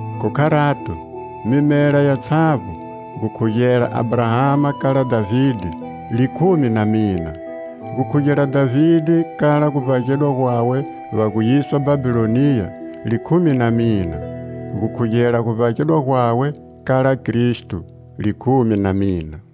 Khu kharato, mimela yatshavbo, gukhugela Abrahama kala Dhavide, likhumi na mina. Gukhugela Dhavide kala guvbagedwa gwawe va gu yiswa Bhabhiloniya, likhumi na mina. Gukhugela guvbagedwa gwawe kala Kristo, likhumi na mina.